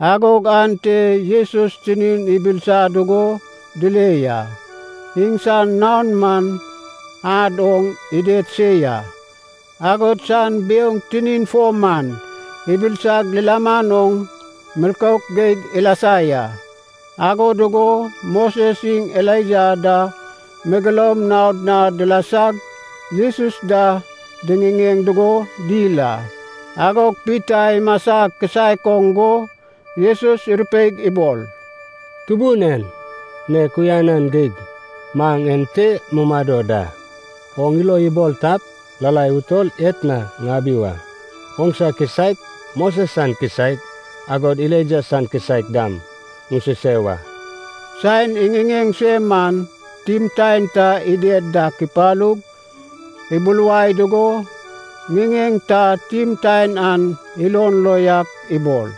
Agog ante Jesus tinin ibilisa dugo dile ya. Iŋsan naon man ad oŋ ided se ya, agod san biouŋ tinin fo man ibilisag lilaman oŋ milkouk geig ilasa ya. Ago dugo Moses iŋ Elaija da megeloum naod na dilasag Jesus da diŋiŋeŋ dugo dil a. Agog Pita imasa kisaek oŋ go Jesus irupeig ibol, “Tubun en, nek uyanan geig maŋ ente mumado da! Oŋ ilo ibol tap, lalai utol etna ŋabi wa, oŋsa kisaek, Mosen san kisaek, agod Elaijah san kisaek dam ŋususe wa.” Saen iŋiŋeŋ se man timtaen ta ided dak ipalug, ibuluwai dugo, ŋiŋeŋ ta timtaen an ilon lo yak ibol,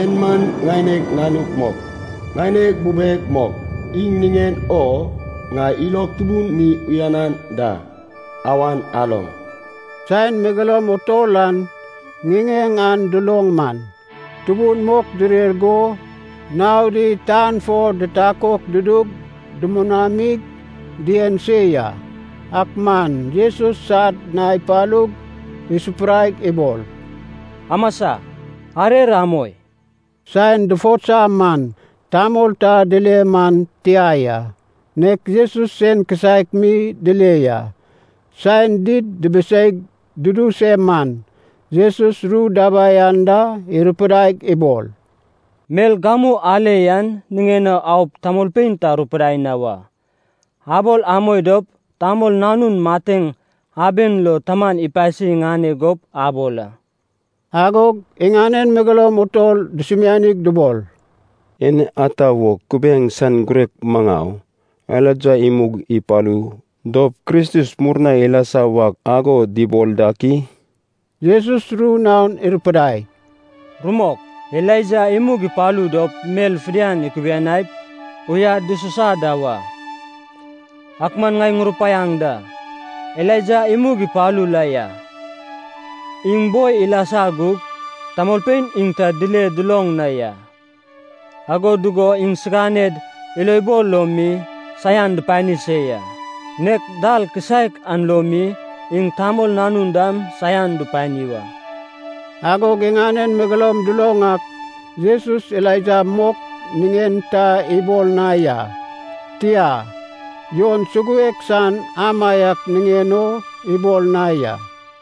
“En man ŋaineg Nanug mok, ŋaineg bubeg mok, iŋ niŋen o ŋai ilog tubun mi uyanan da. Awan aloŋ!” Saen megeloum utol an ŋiŋeŋ an duloŋ man, tubun mok direr go naodi tan fo ditakok dudug dumunamig dien se ya. Ak man Jesus sad na ipalug isupuraig ibol, “Amasa, arer amoi.” Saen dufotsa man, tamol ta dile man tia ya, nek Jesus sen kisaek mi dile ya. Saen did dibiseig dudu se man, Jesus ru dabai anda irupidaig ibol, “Mel gamu ale yan niŋen o aup tamolpein ta arupidai na wa, abol amoi dop Tamol Nanun mateŋ aben lo Taman ipasi iŋane gup abol a.” Agog iŋanen megeloum utol dusumianig dubol, “En ata wo kubiaeŋ san girek maŋau, Elaija imug ipalu dop Kristus murna ilasa wak ago dubol dak i?” Jesus ru naon irupidai, “Rumok, Elaija imug ipalu dop mel fidian ikubuniaip uyad dususa da wa. Ak man ŋai ŋurupaiaŋ da, Elaija imug ipalu la ya. Iŋ bo ilasa gug tamolpein iŋ ta dile duloŋ na ya. Ago dugo iŋsiganed ilobol lo mi saian dupani se ya. Nek dal kisaek an lo mi iŋ Tamol Nanun dam saian dupani wa.” Agog iŋanen megeloum duloŋ ak Jesus Elaija mok niŋen ta ibol na ya, tia, Jon suguek san amaiak niŋen o ibol na ya.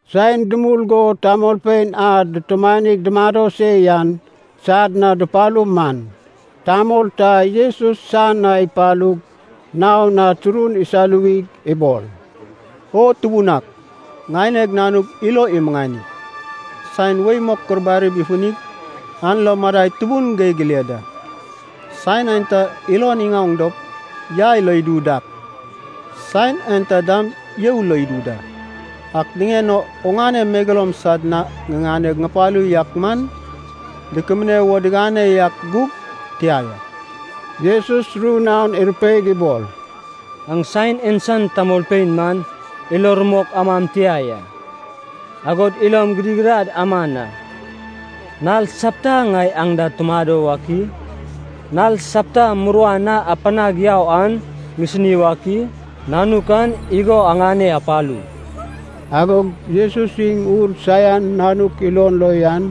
Saen dumul go tamolpein a dutumanig dumado se yan sad na dupalu man, tamol ta Jesus san na ipalug naon na turun isaluwig ibol, “O Tubun ak, ŋaineg nanug ilo imuŋani! Saen wei mok kurbarib ifunig an lo madai tubun geig ile da. Saen aenta ilon iŋaoŋ dop yai lo idu dak, saen aenta dam you lo idu da. Ak niŋen o oŋane megeloum sad na ŋiŋane ŋupalu yak man dukubune wo digane yak gug tia ya.” Jesus ru naon irupeig ibol, “Aŋ saen en san tamolpein man ilo rumok amam tia ya, agod ilom gidigidad aman a. Nal sapta ŋai aŋ da tumado wak i? Nal sapta muruan a apanag yau an ŋisini wak i? Nanuk an igo aŋane apalu.” Agog Jesus iŋ ur saian nanuk ilon lo yan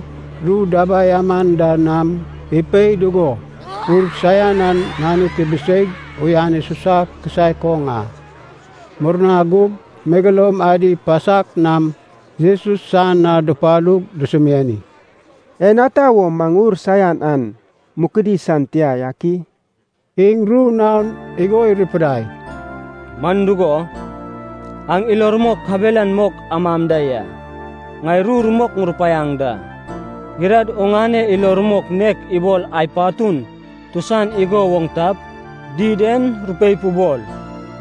ru dabai aman da nam ipei dugo, ur saian an nanuk ibiseig uyan isusa kisaek oŋ a. Murna gug megeloum adi pasak nam Jesus san na dupalug dusumiani, “En ata wo maŋ ur saian an mukudi san tia yak i?” Iŋ ru naon igo irupidai, “Man dugo, aŋ ilo rumok kabelan mok amam da ya. Ŋai ru rumok ŋurupaiaŋ da, gidad oŋane ilo rumok nek ibol ai patun tusan igo woŋ tap, did en rupeip ubol,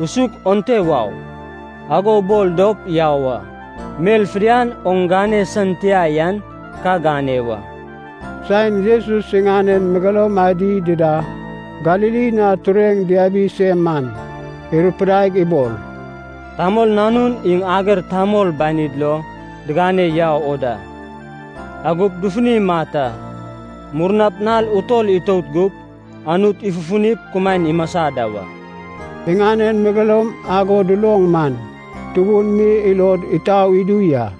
usuk onte wau, ago ubol dop yau a. Mel fidian oŋ gane san tia yan ka gane wa.” Saen Jesus iŋanen megeloum adi dida Galili na tureŋ diabi se man, irupidaig ibol, “Tamol Nanun iŋ ager tamol banid lo digane yau o da. Agop dufuni imat a. Murnap nal utol itout gup, Anut ifufunip kumaen imasa da wa.” Iŋanen megeloum ago duloŋ man, tubun mi ilod itau idu ya.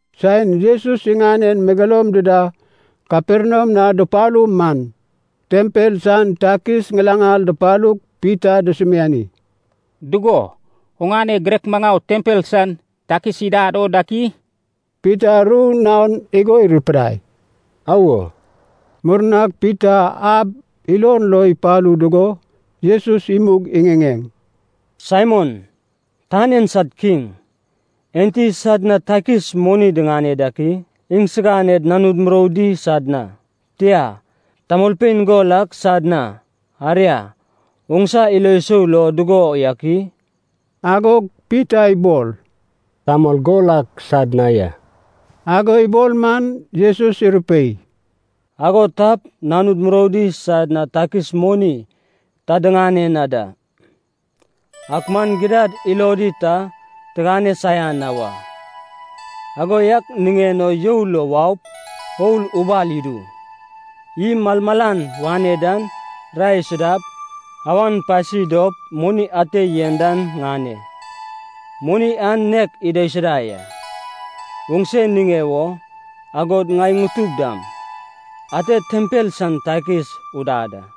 Saen Jesus iŋanen megeloum dida Kaperniam na dupalu man, tempel san takis ŋilaŋal dupalug Pita dusumiani, “Dugo, oŋane girek maŋau tempel san takis idad o dak i?” Pita ru naon igo irupidai, “Awo.” Murnag Pita ab ilon lo ipalu dugo Jesus imug iŋiŋeŋ, “Saimon, tan en sad kiŋ, enti sad na takis moni diŋane dak i? Iŋsiganed nanud muroudi sad na, tia, tamolpein gol ak sad na, aria, oŋsa ilo sou dugo yak i?” Agog Pita ibol, “Tamol gol ak sad na ya.” Ago ibol man Jesus irupei, “Ago tap nanud muroudi sad na takis moni ta digane na da. Ak man gidad ilodi ta tigane saian na wa. Ago yak niŋen o you lo waup oul ubal idu. Iy malmalan wane dan rae isudap, awan pasi dop moni ate yen dan ŋane. Moni an nek idaisuda ya, oŋse niŋe wo, agod ŋai ŋutug dam, ate tempel san takis udad a.”